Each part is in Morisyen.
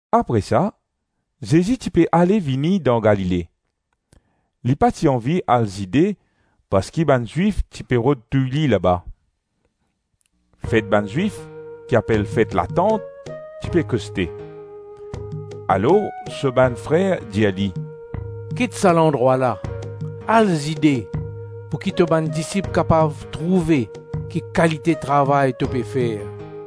Apre sa Zezi ti pe ale vini dan Galile; li pa ti anvi al Zide parski bann Zwif ti pe rod touy li laba. Fet bann Zwif, ki apel Fet Latant, ti pe koste. Alors so bann frer dir li, “Kit sa landrwa la, al Zide, pouki to bann disip kapav trouve ki kalite travay to pe fer.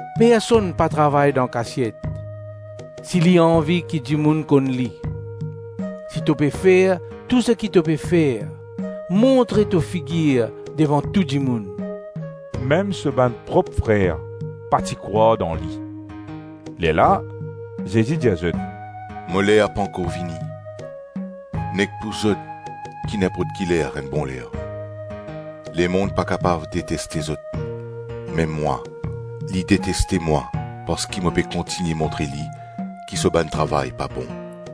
Personn pa travay dan kasiet, si li anvi ki dimoun konn li. Si to pe fer tou seki to pe fer, montre to figir devan tou dimoun.” Mem so bann prop frer pa ti krwar dan Li. Lerla Zezi dir zot, “Mo ler pankor vini. Nek pou zot ki ninport ki ler enn bon ler. Lemonn pa kapav deteste zot, me mwa, li deteste mwa parski mo pe kontigne montre li ki so bann travay pa bon.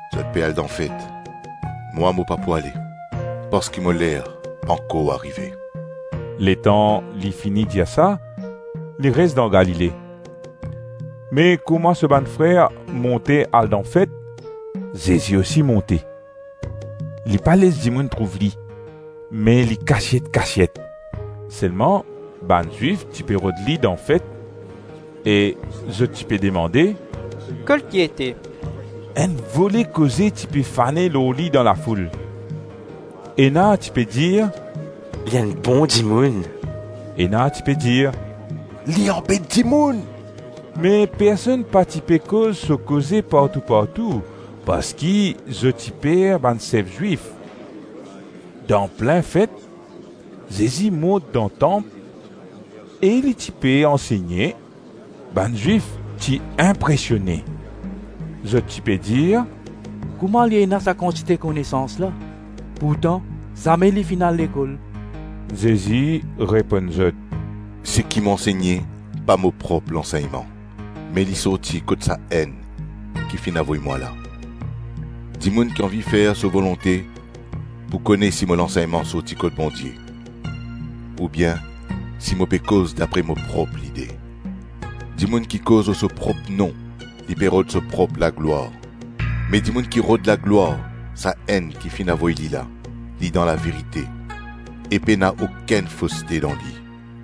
Zot pe al dan fet; mwa mo pa pou ale, parski mo ler pankor arive.” Letan li fini dir sa, li res dan Galile. Me kouma so bann frer monte al dan Fet, Zezi osi monte. Li pa les dimoun trouv li, me li kasiet-kasiet. Selman bann Zwif ti pe rod li dan Fet e zot ti pe demande, “Kot li ete?” Enn vole koze ti pe fane lor li dan lafoul. Ena ti pe dir, “Li enn bon dimoun.” Ena ti pe dir, “Li anbet dimoun.” Me personn pa ti pe koz so koze partou-partou parski zot ti per bann sef Zwif. Dan plin Fet, Zezi mont dan tanp e li ti pe ansegne. Bann Zwif ti inpresione. Zot ti pe dir, “Kouma li ena sa kantite konesans la, pourtan zame li finn al lekol?” Zezi reponn zot, “Seki mo ansegne pa mo prop lansegnman, me li sorti kot Sa-Enn ki finn avoy mwa la. Dimoun ki anvi fer so volonte pou kone si mo lansegnman sorti kot Bondie oubien si mo pe koz dapre mo prop lide. Dimoun ki koz lor so prop nom, li pe rod so prop laglwar; me dimoun ki rod laglwar Sa-Enn ki finn avoy li la, li dan laverite e pena okenn foste dan li.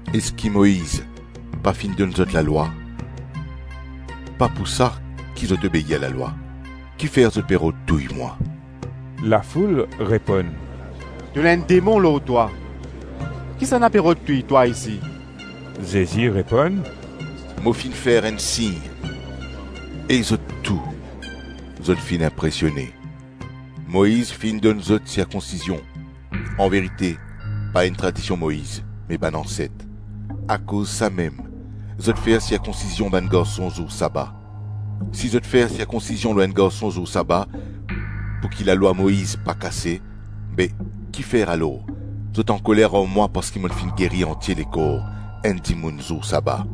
Eski Moiz pa finn donn zot lalwa? Pa pou sa ki zot obeir lalwa. Kifer zot pe rod touy mwa?” Lafoul reponn, “To ena enn demon lor twa. Kisannla pe rod touy twa isi?” Zezi reponn, “Mo finn fer enn sign e zot tou, zot finn inpresione. Moiz finn donn zot sirkonsizion (anverite, pa enn tradision Moiz me bann anset), akoz samem zot fer sirkonsizion bann garson zour saba. Si zot fer sirkonsizion lor enn garson zour saba pouki lalwa Moiz pa kase, be, ki fer alors, zot ankoler ar mwa parski mo finn geri antie lekor enn dimoun zour saba?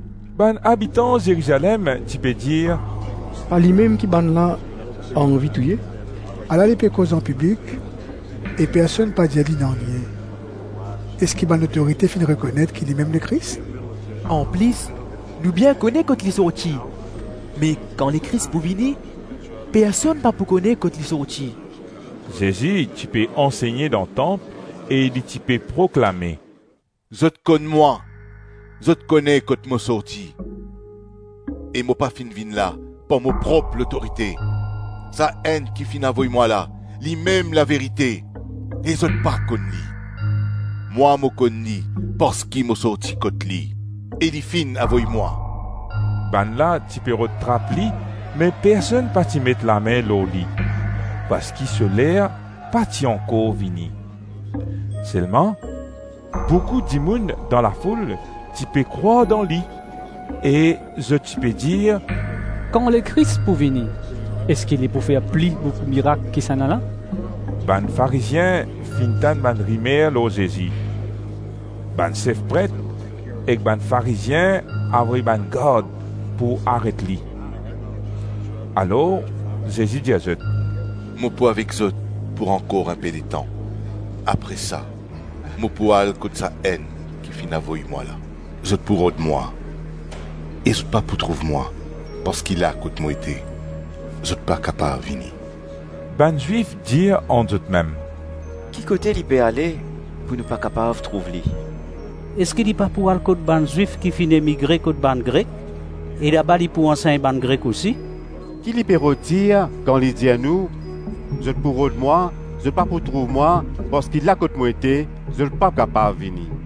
Bann abitan Zerizalem ti pe dir, “Pa limem ki bannla anvi touye? Ala li pe koz anpiblik e personn pa dir li nanye. Eski bann lotorite finn rekonet ki Limem Lekris Anplis, nou bien kone kot li sorti, me kan Lekris pou vini, personn pa pou kone kot li sorti.” Zezi ti pe ansegne dan tanp e li ti pe proklame, “Zot konn mwa; zot kone kot mo sorti e mo pa finn vinn la par mo prop lotorite. Sa-Enn ki finn avoy mwa la, Limem laverite e zot pa konn li. Mwa mo konn li parski mo sorti kot li e li finn avoy mwa.” Bannla ti pe rod trap li me personn pa ti met lame lor li parski so ler pa ti ankor vini. Selman boukou dimoun dan lafoul ti pe krwar dan Li e zot ti pe dir, “Kan Lekris pou vini, eski li pou fer pli boukou mirak ki sennala?” Bann Farizien finn tann bann rimer lor Zezi. Bann sef pret ek bann Farizien avoy bann gard pou aret li. Alor Zezi dir zot, “Mo pou avek zot pou ankor inpe letan, apre sa mo pou al kot Sa-Enn ki finn avoy mwa la. “Zot pou rod mwa e zot pa pou trouv mwa parski la kot mo ete, zot pa kapav vini.” Bann Zwif dir ant zotmem, “Ki kote li pe ale pou nou pa kapav trouv li? Eski li pa pou al kot bann Zwif ki finn emigre kot bann Grek, e laba li pou ansegn bann Grek osi? Ki li pe rod dir kan li dir nou, ‘Zot pou rod mwa, zot pa pou trouv mwa parski la kot mo ete, zot pa kapav vini’?”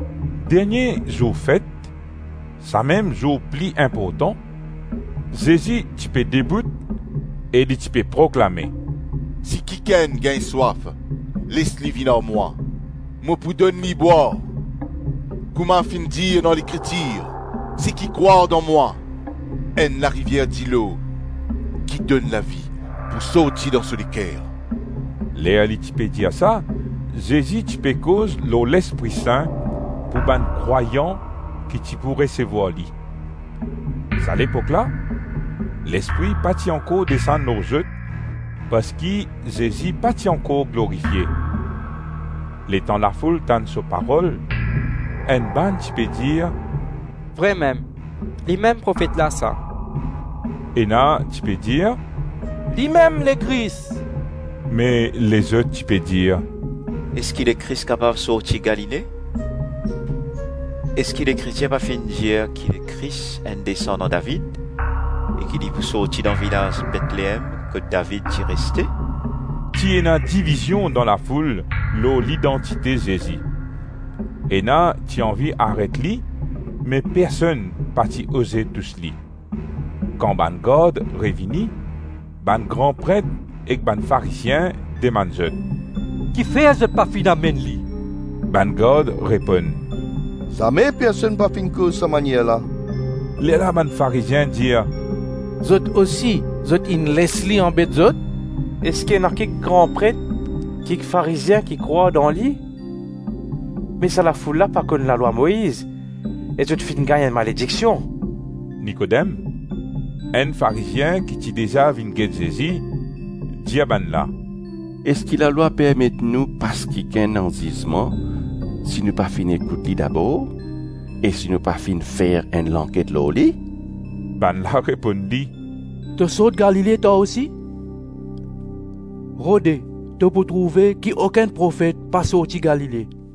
Dernie zour fet, samem zour pli inportan, Zezi ti pe debout e li ti pe proklame, “Si kikenn gagn swaf, les li vinn ar mwa, mo pou donn li bwar. Kouma finn dir dan Lekritir, ‘Seki krwar dan mwa, enn larivier dilo ki donn lavi pou sorti dan so leker.’” Ler li ti pe dir sa Zezi ti pe koz lor Lespri Sin pou bann krwayan ki ti pou resevwar li. Sa lepok la, Lespri pa ti ankor desann lor zot parski Zezi pa ti ankor glorifie. Letan lafoul tann so parol, enn bann ti pe dir, “Vremem, limem Profet la sa”, Ena ti pe dir, “Limem Lekris.” Me lezot ti pe dir, “Eski Lekris kapav sorti Galile?” Eski Lekritir pa finn dir ki Lekris enn desandan David e ki li pou sorti dan vilaz Betleem kot David ti reste? Ti ena divizion dan lafoul lor lidantite Zezi. Ena ti anvi aret li me personn pa ti oze tous li. Kan bann gard revini, bann gran pret ek bann Farizien demann zot, “Kifer zot pa finn amenn li?” Bann gard reponn, “Zame personn pa finn koz sa manier la.” Lerla bann Farizien dir, “Zot osi, zot inn les li anbet zot? Eski ena kik gran pret, kik Farizien ki krwar dan li? Me sa la foul la pa konn lalwa Moiz e zot finn gagn enn malediksion.” Nikodem, enn Farizien ki ti deza vinn get Zezi, dir bannla, “Eski lalwa permet nou pas kikenn anzizman si nou pa finn ekout li dabor e si nou pa finn fer enn lanket lor li?” Bannla reponn li, “To sort Galile, twa osi? Rode to pou trouve ki okenn profet pa sorti Galile.”